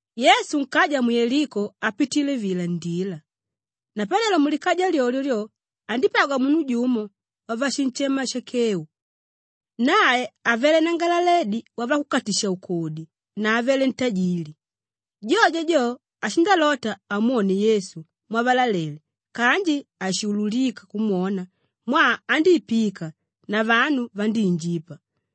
Yesu nkaja mu Yeliko apitile vila ndila. Napanelo mulikaja lyolyo lyo, andípagwa munu jumo wavashinshema Shakeu. Nae avele nanangalaledi wavakukatisha-ukodi na avele ntajili. Jojo jo, ashindalota amwone Yesu mwavalalele kanji haishululika kumwona mwaa andíipika na vanu vandíinjipa.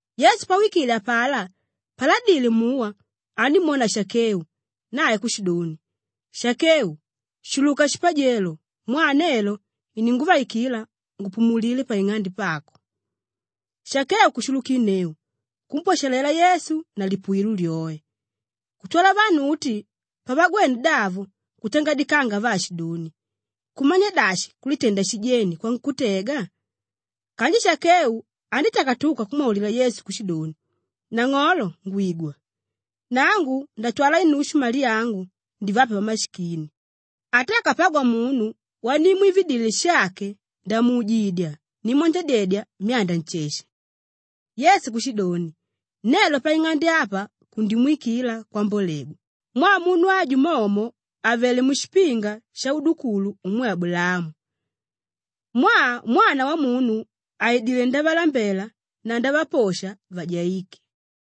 Yesu pawikile apalá paladile muwa andímwona Shakeu nae kushidoni, “Shakeu! Shuluka shipajelo mwaa nelo ininguvaikila ngupumulilile paing'ande pako.” Shakeu kushulukinneu kumpwashalela Yesu na lipuwilo lyoe. Kutwala vanu uti pavagwene davo kutangadikanga vaashidoni, “Kumanya dashi kulitenda shijeni kwankútega!” Kanji Shakeu andítakatuka kumwaulila Yesu kushidoni, “Nang'olo ngwigwa, nangu ndatwala inushu yamali angu ndivape vamashikini; ata akapagwa munu wanimwividile shake, ndamuujidya nimwanjadyedya myanda nsheshe.” Yesu kushidoni, “Nelo paing'ande apa kundimwikila kwambolegwa mwaa munu aju momo avelé mushipinga shaudukulu umwe Abulaamu. Mwaa Mwana Wamunu aidilé ndavalambela na ndavaposha vajaíke.”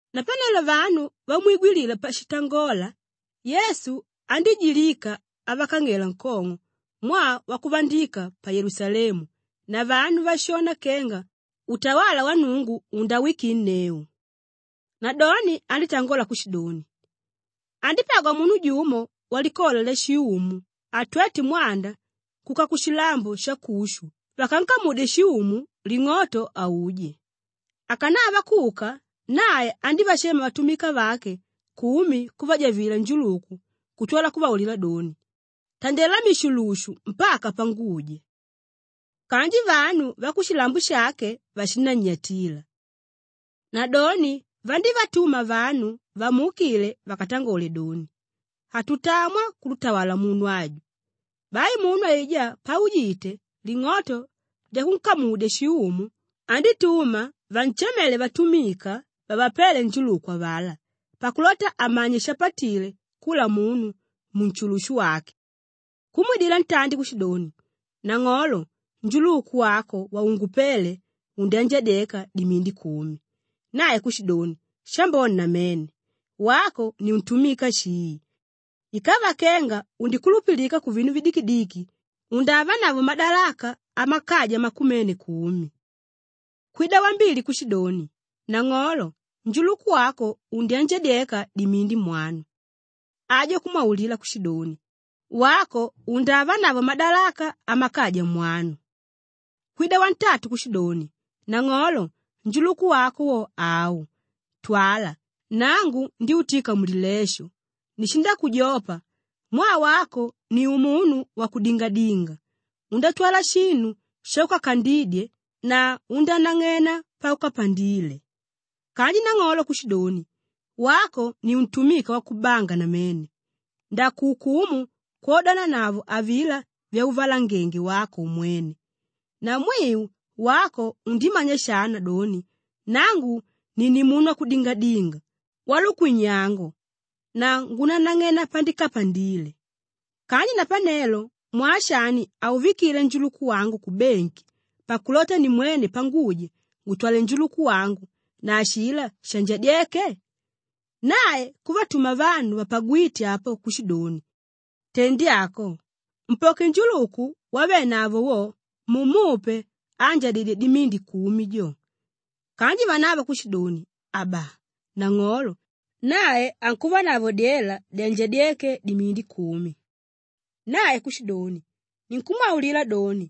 Napanelo vanu vamwigwilila pashitangola, Yesu andíjilika avakang'ela nkong'o mwaa wakuvandika pa Yelusalemu na vanu vashona kenga utawala wa Nnungu undawikinneu. Nadoni andítangola kushidoni, “Andípagwa munu jumo walikola lyashiumu atwéte mwanda kuka kushilambo shakushu vakankamudye shiumu ling'oto auje. Akanava kuka, nae andívashema vatumika vake kumi kuvajavila njuluku kutwala kuvaulila doni, ‘Tandela mishulushu mpaka panguja.’ Kanji vanu vakushilambo shake vashinannyatila. Nadoni vandívatuma vanu vamuukile vakatangole doni, ‘Hatutamwa kututawala munu aju.’ Bai munu aijá paujite ling'oto lyakunkamudya shiumu, andítuma vanshamele vatumika vavapéle njuluku avalá pakulota amanye shapatile kula munu munshulushu wake. Kumwidila ntandi kushidoni, ‘Nang'olo, njuluku wako waungupéle, undyanjadyeka dimindi kumi.’ Nae kushidoni, ‘Shambone namene! Wako ni untumika shii. Ikava kenga undikulupilika kuvinu vidikidiki, undavanavo madalaka amakaja makumene kumi.’ Kwida wambili kushidoni, ‘Nang'olo, njuluku wako undyanjadyeka dimindi mwanu.’ Ajo kumwaulila kushidoni, ‘Wako undavanavo madalaka amakaja mwanu.’ Kwida wantatu kushidoni, ‘Nang'olo njuluku wako wo au, twala, nangu ndyútika mulilesho; nishindakujopa mwaa wako ni umunu wakudingadinga, undátwala shinu shaukakandidye na undánang'ena paukapandile.’ Kanji nang'olo kushidoni, ‘Wako ni untumika wakubanga namene! Ndakuukumu kwodananavo avilá vyauvalangenge wako umwene. Namwiu, wako undímanya shana doni nangu ni nimunu wakudingadinga, walukwinnyango na ngunanang'ena pandikapandile. Kanji napanelo mwaa shani hauvikile njuluku wangu kubengi pakulota nimwene panguja ngutwale njuluku wangu na ashilá shanjadyéke?’ Nae kuvatuma vanu vapagwíte apo kushidoni, ‘Tendi ako, mpoke njuluku wavenavo wo mumupe áanjadidye dimindi kumi jo.’ Kanji vanavo kushidoni, ‘Aba! Nang'olo, nae ankuvanavo dyela dyanjadyéke dimindi kumi.’ Nae kushidoni, ‘Ninkumwaulila doni,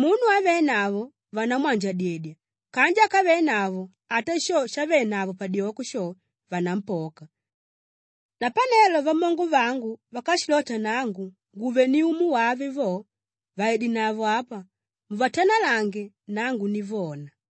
munu ávenavo vanamwanjadyedya kanji ákavenavo ata sho shavénavo padyoko sho, vanampoka. Napanelo vamongo vangu vákashilota nangu nguve ni umu wave vo, vaidenavo apa muvatanalange nangu nivona.’”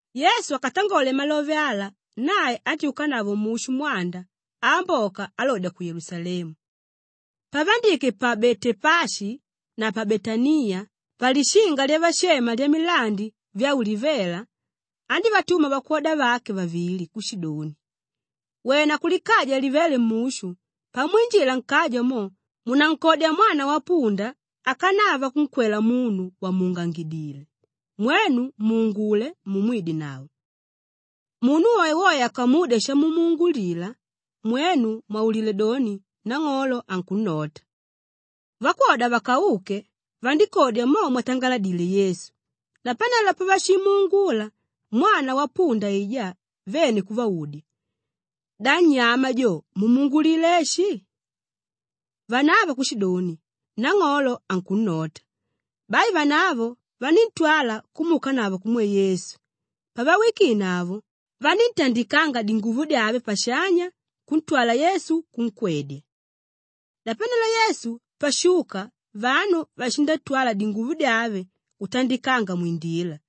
Yesu akatangole malove ala nae andyúkanavo mushu mwanda aamboka alodya ku Yelusalemu. Pavandike pa Betepashi na pa Betaniya, palishinga lyavashema Lyamilandi Vyaulivela, andívatuma vakwoda vake vavili kushidoni, “Wena kulikaja livéle mushu! Pamwinjila nkaja mo, munankodya mwana wapunda akanava kunkwela munu vàmuungangidile; mwenu muungule mumwidenavo! Munu woewoe akamudya shamumuungulila, mwenu mwaulile doni, ‘Nang'olo ankunnota.’” Vakwoda vakauke, vandíkodya mo mwatangaladile Yesu. Napanelo pavashimuungula mwana wapunda aijá vene kuvaudya, “Da nnyama jo mumuungulila eshi?” Vanavo kushidoni, “Nang'olo ankunnota.” Bai vanavo vaníntwala kumuukanavo kumwe Yesu. Pavawikinavo, vaníntandikanga dinguvo dyave pashanya kuntwala Yesu kunkwedya. Napanelo Yesu pashuka vanu vashindatwala dinguvo dyave kutandika mwindila.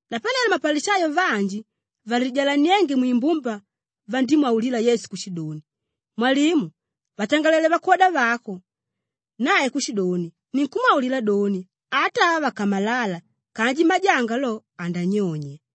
Napanelo mapalishayo vanji valijalaniénge mwimbumba vandímwaulila Yesu kushidoni, “Mwalimu, vatangalele vakwoda vako!” Nae kushidoni, “Ninkumwaulila doni, ata ava vakamalala kanji majanga lo andanyonya.”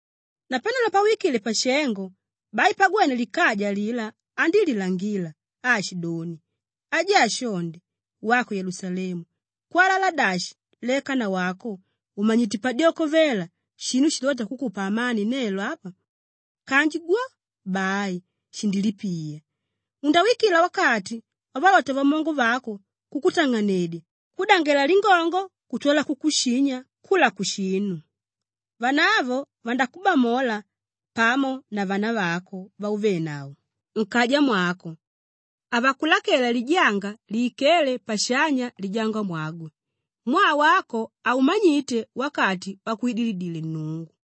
Napanelo pawikile pashengo, bai pagwene likaja alilá andílilangila aashidoni, “Ajaa shonde! Wako Yelusalemu, kwalala dashi leka nawako ùmanyite padyoko vela shinu shilóta kukupa amani nelo apa! Kanji gwo, bai, shindilipiya. Undakuwikila wakati wavalota vamongo vako kukutang'anedya kukudangela lingongo kutwala kukushinya kula kushinu. Vanavo vandakubamola pamo na vanavako vauvénavo nkaja mwako; havakulakela lijanga lìikele pashanya lijangamwagwe mwaa wako haumanyite wakati wakwidilile Nnungu.”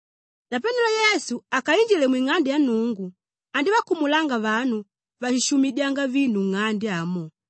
Napanelo Yesu akainjile mwing'ande ya Nnungu andívakumulanga vanu váshishumidyanga vinu nng'ande amo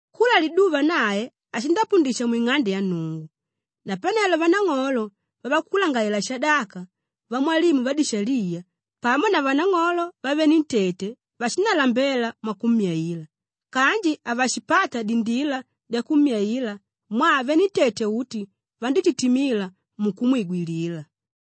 Kula liduva nae ashindapundisha mwing'ande ya Nnungu. Napanelo vanang'olo vavakulangalalela-shadaka, vamwalimu vadishaliya pamo na vanang'olo vavenentete vashindalambela mwakummyaila kanji havashipata dindila dyakummyaila mwaa venentete uti vandítitimila mukumwigwilila.